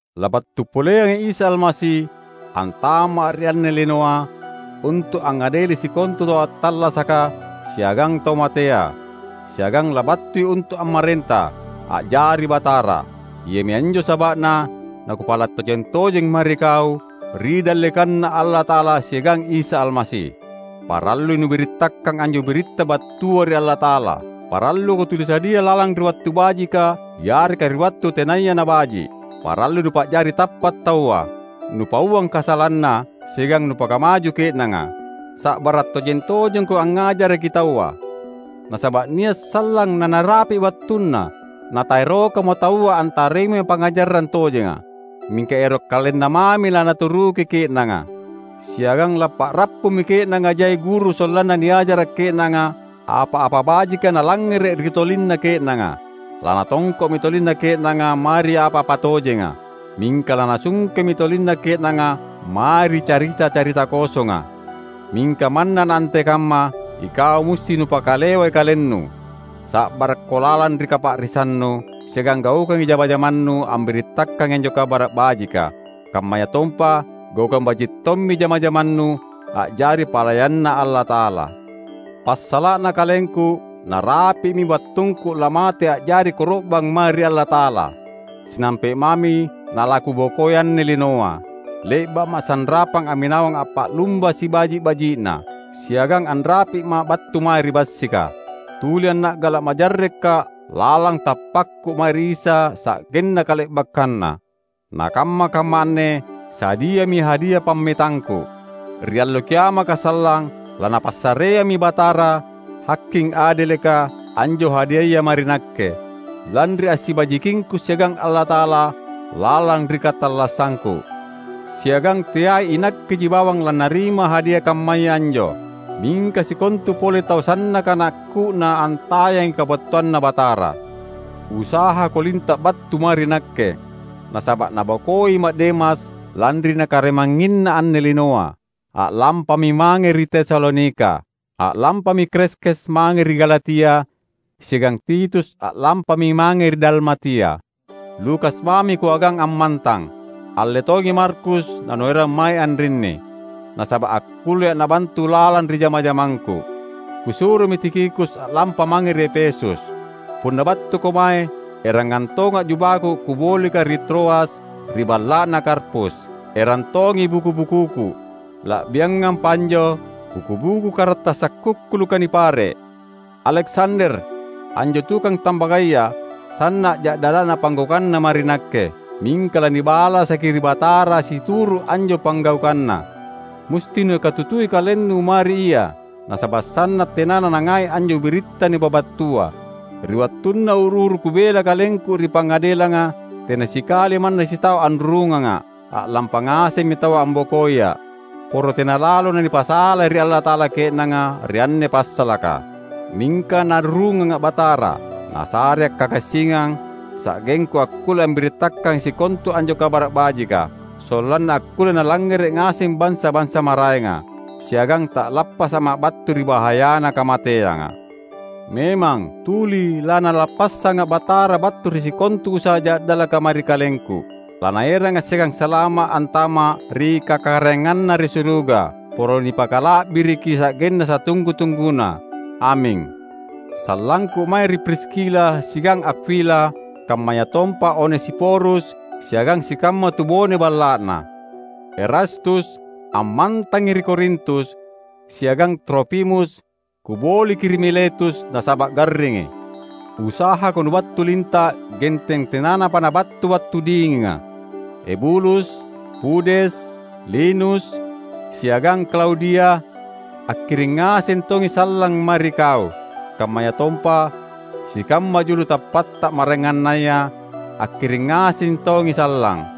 Labattu poleangi Isa Almasi antama’ ri anne linoa untu’ angngadeli sikontu tau attallasaka siagang tau matea; siagang labattui untu’ ammarenta, a’jari Batara. Iami anjo saba’na nakupala’ tojeng-tojeng mae ri kau, ri dallekanNa Allata’ala siagang Isa Almasi: Parallui nubirittakang anjo biritta battua ri Allata’ala; paralluko tuli sadia lalang ri wattu bajika yareka ri wattu tenaya nabaji’. Parallui nupa’jari tappa’ taua, nupauang kasalanna, siagang nupakamaju ke’nanga. Sa’bara’ tojeng-tojengko angngajaraki taua. Nasaba’ nia’ sallang nanarapi’ wattunna nataerokamo taua antarimai pangngajarang tojenga. Mingka ero’ kalenna mami lanaturuki ke’nanga; siagang lappa’rappummi ke’nanga jai guru sollanna niajara’ ke’nanga apa-apa bajika nalangngere’ ri tolinna ke’nanga. Lanatongko’mi tolinna ke’nanga mae ri apa-apa tojenga, mingka lanasungkemi tolinna ke’nanga mae ri carita-carita kosonga. Mingka manna naantekamma, ikau musti nupakalewai kalennu. Sa’barakko lalang ri kapa’risannu, siagang gaukangi jama-jamannu ambirittakangi anjo Kabara’ Bajika, kammayatompa gaukang baji’ tommi jama-jamannu a’jari palayanNa Allata’ala. Passala’na kalengku, narapi’mi wattungku lamate a’jari koro’bang mae ri Allata’ala. Sinampe’ mami nalakubokoi anne linoa. Le’ba’ma’ sanrapang amminawang appa’lumba sibaji’-baji’na, siagang anrapi’ma’ battu mae ri bassika. Tuli anna’gala’ majarreka’ lalang tappakku mae ri Isa sanggenna kale’bakkanna. Na kamma-kamma anne sadiami hadia pammetangku. Ri Allo Kiamaka sallang, laNapassareammi Batara, Haking adeleka, anjo hadiaya mae ri nakke, lanri assibajikingku siagang Allata’ala lalang ri katallassangku. Siagang teai inakkeji bawang lannarima hadia kammaya anjo, mingka sikontu pole tau sannaka nakku’na antayangi kabattuanNa Batara. Usahako linta’ battu mae ri nakke, nasaba’ nabokoima’ Demas lanri nakarimangnginna anne linoa. A’lampami mange ri Tesalonika. A’lampami Kreskes mange ri Galatia, siagang Titus a’lampami mange ri Dalmatia. Lukas mami kuagang ammantang. Alle tongi Markus nanuerang mae anrinni, nasaba’ akkullea’ nabantu lalang ri jama-jamangku. Kusuromi Tikhikus a’lampa mange ri Efesus. Punna battuko mae, erangang tonga’ jubaku kubolika ri Troas ri balla’na Karpus. Erang tongi buku-bukuku, la’biangampa anjo buku-buku karattasa’ kukkuluka nipare’. Aleksander, anjo tukang tambagaya sanna’ ja’dala’na panggaukanna mae ri nakke. Mingka lanibalasaki ri Batara situru’ anjo panggaukanna. Musti nukatutui kalennu mae ri ia, nasaba’ sanna’ tenana nangai anjo biritta nipabattua. Ri wattunna uru-uru kubela kalengku ri pangadelanga, tena sikali manna sitau anrurunganga’; a’lampa ngasemmi taua ambokoia’. Poro tena lalo nanipasalai ri Allata’ala ke’nanga ri anne passalaka! Mingka Narurunganga’ Batara. Nasarea’ kagassingang sa’gengku akkulle ambirittakangi sikontu anjo Kabara’ Bajika, sollanna akkulle nalangngere’ ngaseng bansa-bansa maraenga. Siagang ta’lappasa’ma’ battu ri bahayana kamateanga. Memang, tuli laNalappassanga’ Batara battu ri sikontu usaha ja’dalaka mae ri kalengku. LaNaeranga’ siagang salama’ antama’ ri KakaraenganNa ri suruga. Poro nipakala’biriki sa’genna satunggu-tungguna! Aming. Sallangku mae ri Priskila siagang Akwila kammayatompa Onesiforus siagang sikamma tubone balla’na. Erastus ammantangi ri Korintus, siagang Trofimus kuboliki ri Miletus nasaba’ garringi. Usahako nubattu linta’ genteng tenanapa nabattu wattu dinginga. Ebulus, Pudes, Linus, siagang Klaudia, akkiring ngaseng tongi sallang mae ri kau; kammayatompa sikamma julu tappatta maraengannaya, akkiring ngaseng tongi sallang.